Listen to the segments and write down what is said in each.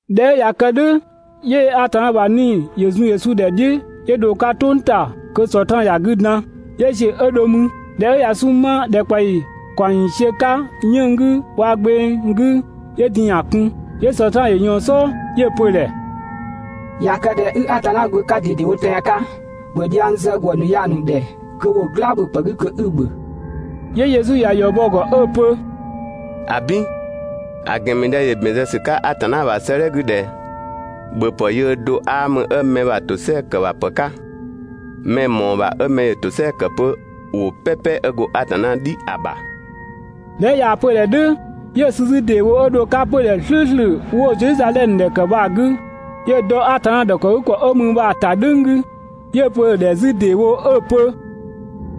꞊Dhɛ 'ö ꞊ya kë "dhʋ̈ 'yö Atanna ‑bha 'Nii‑ ‑yö zun Yesu ‑dhɛ "dhiʋ̈ 'yö dho‑ 'ka "tʋng ‑ta kö Sɔtraan ‑ya 'gü dan. 'Yö ‑ziö 'ö dho mü. ꞊Dhɛ 'ö ꞊ya 'sunng‑ 'ma ‑dhɛkpaɔyi ‑kaɔng ‑yiisiö 'ka 'yënng‑ 'gü waa‑ gbeng 'gü, 'yö din‑ ‑ya kun. 'Yö Sɔtraan ‑yö ꞊yɔɔn‑ "sɔɔ 'yö‑ pö‑ ‑dhɛ: «꞊Ya kë ꞊dhɛ 'i Atanna Gbö 'ka ꞊dedewo tɛan‑ 'ka, ‑bhö dhiang zë ‑gwë ‑nu ya‑ ‑nu ‑dhɛ kö ‑wo "gla ‑bhöpë 'gü kö 'i‑ ‑bhö!» 'Yö Yesu ‑ya ‑yɔ bɔ‑ ‑gɔ 'ö‑ pö: «‑Abin, ‑a ‑gɛn ‑mü ꞊dhɛ ‑yö ‑bɛn zë ‑sü 'ka Atanna ‑bha 'sëëdhɛ 'gü ꞊dhɛ: ‹‑Bhöpë yöö do 'aa mü 'ö mɛ ‑bha ‑tosɛa ‑kë ‑bha ‑pë 'ka, mɛ‑ mɔɔ‑ ‑bha 'ö mɛ ‑yö ‑tosɛa ‑kë 'pö ‑wʋ "pɛpɛ 'ö go Atanna "dhi ‑a ‑bha.› ꞊Dhɛ 'ö ꞊yaa‑ pö‑ ‑dhɛ "dhʋ̈, 'yö‑ sü 'zü ‑deewo 'ö dho‑ 'ka 'pödhɛ "slʋ̈ʋ̈slʋ̈ 'wo‑ Zedhizadhɛmö ‑dhɛ ‑kë bha‑ 'gü, 'yö‑ dɔ Atanna ‑dhɔkëgükɔ 'ö mü bha‑ ‑ta "dhʋ̈ng 'gü, 'yö‑ pö‑ ‑dhɛ 'zü ‑deewo 'ö‑ pö: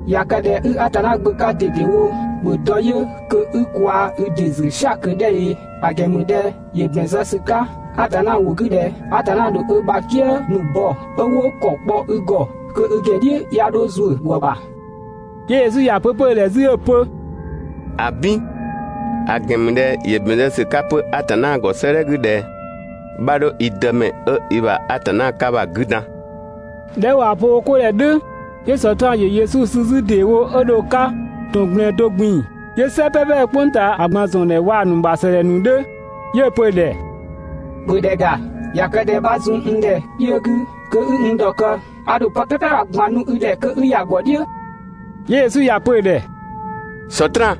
«꞊Ya kë ꞊dhɛ 'i Atanna Gbö 'ka ꞊dedewo, ‑bhö dɔ yö kö 'i kwaa‑ i ‑dɩ ‑zü "sia‑ ꞊kö 'dhɛ ꞊ee! ‑A ‑gɛn ‑mü ꞊dhɛ ‑yö ‑bɛn zë ‑sü 'ka Atanna ‑wʋ 'gü ꞊dhɛ: ‹Atanna ‑dho ö ‑bha "kië ‑nu bɔ 'ö 'wo ‑kɔ kpɔ i ‑gɔ kö i ‑gɛn "dhiʋ̈ 'ya 'dho ‑zuö ‑gwë ‑bha.› 'Yö Yesu ‑ya pö 'pö‑ ‑dhɛ 'zü 'ö‑ pö: «‑Abin, ‑a ‑gɛn ‑mü ꞊dhɛ ‑yö ‑bɛn zë ‑sü 'ka 'pö Atanna ‑gɔ 'sëëdhɛ 'gü ꞊dhɛ: ‹'Bha 'dho i Dëmɛ 'ö i ‑bha Atanna 'ka bha‑ 'gü dan!› ꞊Dhɛ 'ö ꞊waa‑ pö wo 'ko ‑dhɛ "dhʋ̈, 'yö Sɔtraan ‑yö Yesu sü 'zü ‑dee wo 'ö dho‑ 'ka ‑tɔn ꞊gblɛɛn do ꞊gbin‑, 'yö "sɛ "pɛpɛ 'ö "kpʋng ꞊taa ‑a ꞊gban ‑zɔn ‑dhɛ waa‑ ‑nu ‑bha ‑sëdhɛ ‑nu 'dhö 'yö‑ pö‑ ‑dhɛ: «‑Bhö ‑dhɛ ‑ga, ꞊ya kë ꞊dhɛ 'bha zun n ‑dhɛ kpiö 'gü, kö 'i n ‑dhɔkë, a ‑dho pë "pɛpɛ bha‑ ꞊gban nu i ‑dhɛ kö 'i ‑ya ‑gɔ "dhiʋ̈.» 'Yö Yesu ‑ya pö‑ ‑dhɛ: «Sɔtraan,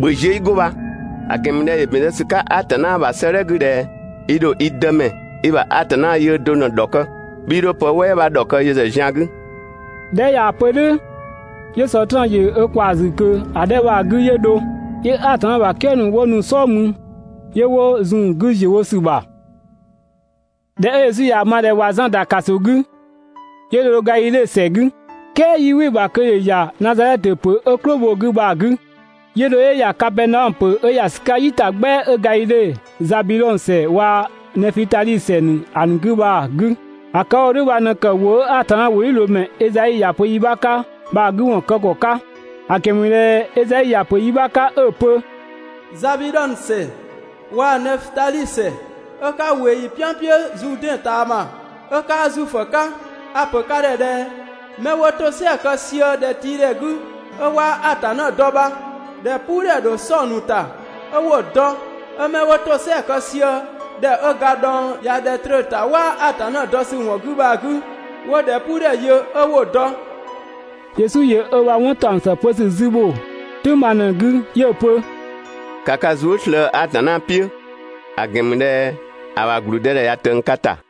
‑bhö ziö 'i 'go bha, ‑a ‑gɛn ‑mü ꞊dhɛ ‑yö ‑bɛn zë ‑sü 'ka Atanna ‑bha 'sëëdhɛ 'gü ꞊dhɛ: ‹I ‑dho i Dëmɛ, i ‑bha Atanna yöö do ꞊në‑ ‑dhɔkë, 'bhii 'dho pë "wɛɛ 'bha ‑dhɔkë yö ‑zë zian 'gü›. ꞊Dhɛ 'ö ꞊yaa‑ pö "dhʋ̈, 'yö Sɔtraan ‑yö ö ꞊kwaa‑ ‑zü ꞊kö ‑a 'dhɛ bha‑ 'gü 'yö dho. 'Yö Atanna ‑bha "kië ‑nu 'wo nu‑ "sɔɔ mü 'yö 'wo zun‑ 'gü ‑ziö wo ‑sü ‑bha. ꞊Dhɛ 'ö Yesu ꞊yaa‑ ma ꞊dhɛ ꞊wa Zan ‑da ‑kaso 'gü, 'yö dho Gadhidhe ‑sɛ 'gü. "Kɛɛ 'yii "wɩ‑ ‑bha kö ‑yö ‑ya Nazadhɛtö ‑pö 'ö "klʋ bho‑ 'gü bha‑ 'gü, 'yö dho 'yö ‑ya Kapɛɛnaɔmö ‑pö 'ö ‑ya ‑sü 'ka "yitagbɛa 'ö Gadhidhe, Zabidhɔng ‑sɛ waa‑ Nɛfutali ‑sɛ ‑a ‑nu 'gü bha‑ 'gü. ‑A ‑kë 'ö‑ wo "dhʋ̈ bha ꞊në ‑kë ‑wʋ 'ö Atanna ‑wʋdhiʋ̈loomɛ Ezai ‑ya pö yi 'bha 'ka bha‑ 'gü ‑wɔn kë ‑kɔ 'ka; ‑a ‑gɛn ‑mü ꞊dhɛ Ezai ‑ya ‑pö yi 'bha 'ka 'ö‑ pö: «Zabidhɔng ‑sɛ waa‑ Nɛfutali ‑sɛ 'ö 'ka ꞊wee ‑yi "pɛan "piʋ̈ Zuudɛn ꞊taama, 'ö 'kaa Zuifö 'ka, a‑ ‑pö ka ‑dhɛ ꞊dhɛ: 'mɛ 'wo ‑tosɛa kë sië ‑dhɛtiidhɛ 'gü ('ö 'waa Atanna dɔ) bha, ‑dhɛpuudhɛ ‑dho 'sɔ‑ ‑nu ‑ta ('ö 'wo‑ dɔ)! 'Ö 'mɛ 'wo ‑tosɛa kë sië ‑dhɛ 'ö ga dhɔng ꞊ya ‑dhɛ tröö‑ ‑ta ('waa Atanna dɔ ‑sü ‑wɔn 'gü) bha, 'wo ‑dhɛpuudhɛ yö ('ö 'wo‑ dɔ).» Yesu ‑yö ö ‑bha 'wɔn ‑taɔng ‑së pö ‑sü 'zü ‑bho "tʋ̈ng bha ꞊në‑ 'gü 'yö‑ pö: «‑Ka ka zuë" slëë‑ Atanna "piʋ̈, ‑a ‑gɛn ‑mü ꞊dhɛ ‑a ‑bha ‑gblüdëdhɛ ꞊ya ꞊tëng ka ‑ta!»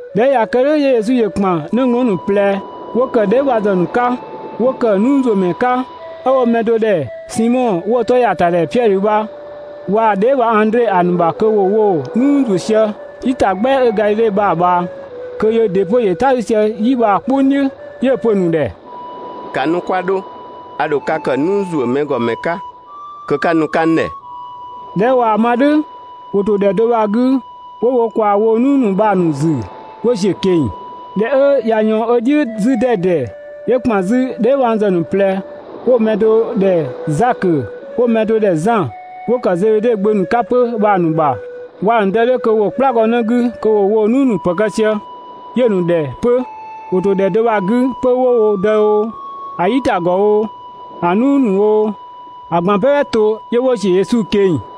꞊Dhɛ 'ö ꞊ya kë "dhʋ̈ 'yö Yesu ‑yö ‑kpan 'nëglɔɔn ‑nu ꞊plɛ 'wo ‑kë dheebhangzë ‑nu 'ka, 'wo ‑kë "nuuzuömɛ 'ka, 'ö 'wo‑ mɛ do ‑dhɛ Simɔ 'wo‑ 'tɔ ꞊ya ‑ta ‑dhɛ Piɛdhö bha waa‑ dheebhang Andre, ‑a ‑nu ‑bha kö ‑wo woo‑ "nuu ‑zuö sië "yi ‑ta "gbɛa 'ö Gadhidhe bha‑ ꞊bhaa, kö yöö ‑dɩ 'pö ‑yö "ta 'sü sië "yi bha‑ "kpʋng "dhiʋ̈. 'Yö‑ pö‑ ‑nu ‑dhɛ: «‑Ka nu 'kwa 'dho! A ‑dho ka kë "nuu ‑zuö mɛ ‑gɔ ‑mɛ 'ka kö 'ka nu‑ ‑nu 'ka n ‑dhɛ!» ꞊Dhɛ 'ö ꞊waa‑ ma "dhʋ̈, ‑wo ‑to ‑dhɛ do bha‑ 'gü 'wo wo ꞊kwaa woo‑ "nuu ‑nu bha‑ ‑nu ‑zü 'wo ‑ziö ꞊keng‑. ꞊Dhɛ 'ö ꞊ya ꞊yɔɔn ö "dhiʋ̈ 'zü 'dɛdɛ, 'yö ‑kpan 'zü dheebhangzë ‑nu ꞊plɛ 'wo‑ mɛ do ‑dhɛ Zakö 'wo‑ mɛ do ‑dhɛ Zan, 'wo ‑kë Zebede gbö ‑nu 'ka 'pö bha‑ ‑nu ‑bha waa‑ ‑nu dë 'dhö kö ‑wo "kplagɔnë 'gü kö ‑wo woo‑ "nuu ‑nu pë kë sië, 'yö‑ ‑nu ‑dhɛ 'pö. ‑Wo ‑to ‑dhɛ do bha‑ 'gü 'pö 'wo wo dë oo, ‑a "yitagɔ oo, (‑a "nuu ‑nu oo), ‑a ꞊gban "pɛpɛ to, 'yö 'wo ‑ziö Yesu ꞊keng‑.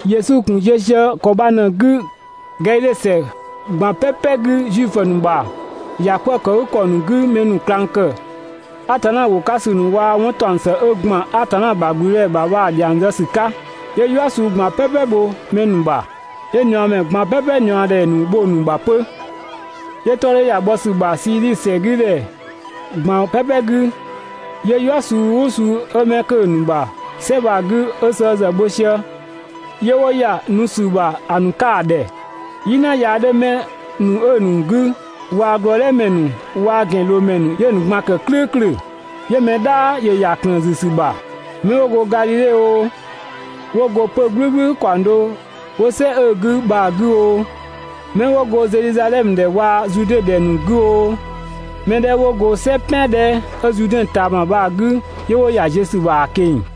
Yesu ‑gun ziö sië ‑kɔ bha ꞊në‑ 'gü Gadhidhe ‑sɛ ꞊gban "pɛpɛ 'gü Zuifö ‑nu ‑bha ‑yakwëëkëgükɔ ‑nu 'gü mɛ ‑nu ꞊klang ‑kë Atanna ‑wʋ 'ka ‑sü ‑nu waa‑ 'wɔn ‑taɔng ‑së 'ö ‑gban Atanna ‑bha ‑gblüdëdhɛ ‑bha bha‑ ‑dhiang zë ‑sü 'ka. 'Yö "yua suu ꞊gban "pɛpɛ bho mɛ ‑nu bha, 'yö ꞊niɔɔmɛ ꞊gban "pɛpɛ ꞊niɔɔdhɛ ‑nu bho‑ ‑nu ‑bha 'pö. 'Yö‑ 'tɔ 'dhö ‑ya bhɔ ‑sü ‑bha Siidhi ‑sɛ 'gü ‑dhɛ ꞊gban "pɛpɛ 'gü, 'yö "yua suu "ʋʋ suu 'ö 'mɛ 'kö‑ ‑nu ‑bha "sɛ bha‑ 'gü 'ö sëë ‑zë bho sië, 'yö 'wo ‑ya nu ‑sü ‑bha ‑a ‑nu 'ka ‑a ‑dhɛ. "Yina yaa 'dhö 'mɛ ‑nu 'ö‑ ‑nu 'gü waa‑ glɔɔdhɛmɛ ‑nu waa‑ ‑gɛnloomɛ ‑nu, 'yö‑ ‑nu ꞊gban ‑kë "klʋ̈ʋ̈klʋ̈. 'Yö mɛ "dhaa ‑yö ‑ya ‑klëën ‑zü ‑sü ‑bha, 'mɛ 'wo go Gadhidhe oo, 'wo go 'pö‑ "gblʋ̈gblʋ̈ ‑kaɔng do 'wo "sɛ 'ö‑ 'gü bha‑ 'gü oo, 'mɛ 'wo go Zedhizadhɛmö ‑dhɛ waa‑ Zude ‑dhɛ ‑nu 'gü oo, mɛ 'dhɛ 'wo go "sɛ "pɛan 'dhɛ 'ö Zuudɛn ꞊taama bha‑ 'gü, 'yö 'wo ‑ya ziö ‑sü ‑bha ‑a ꞊keng‑.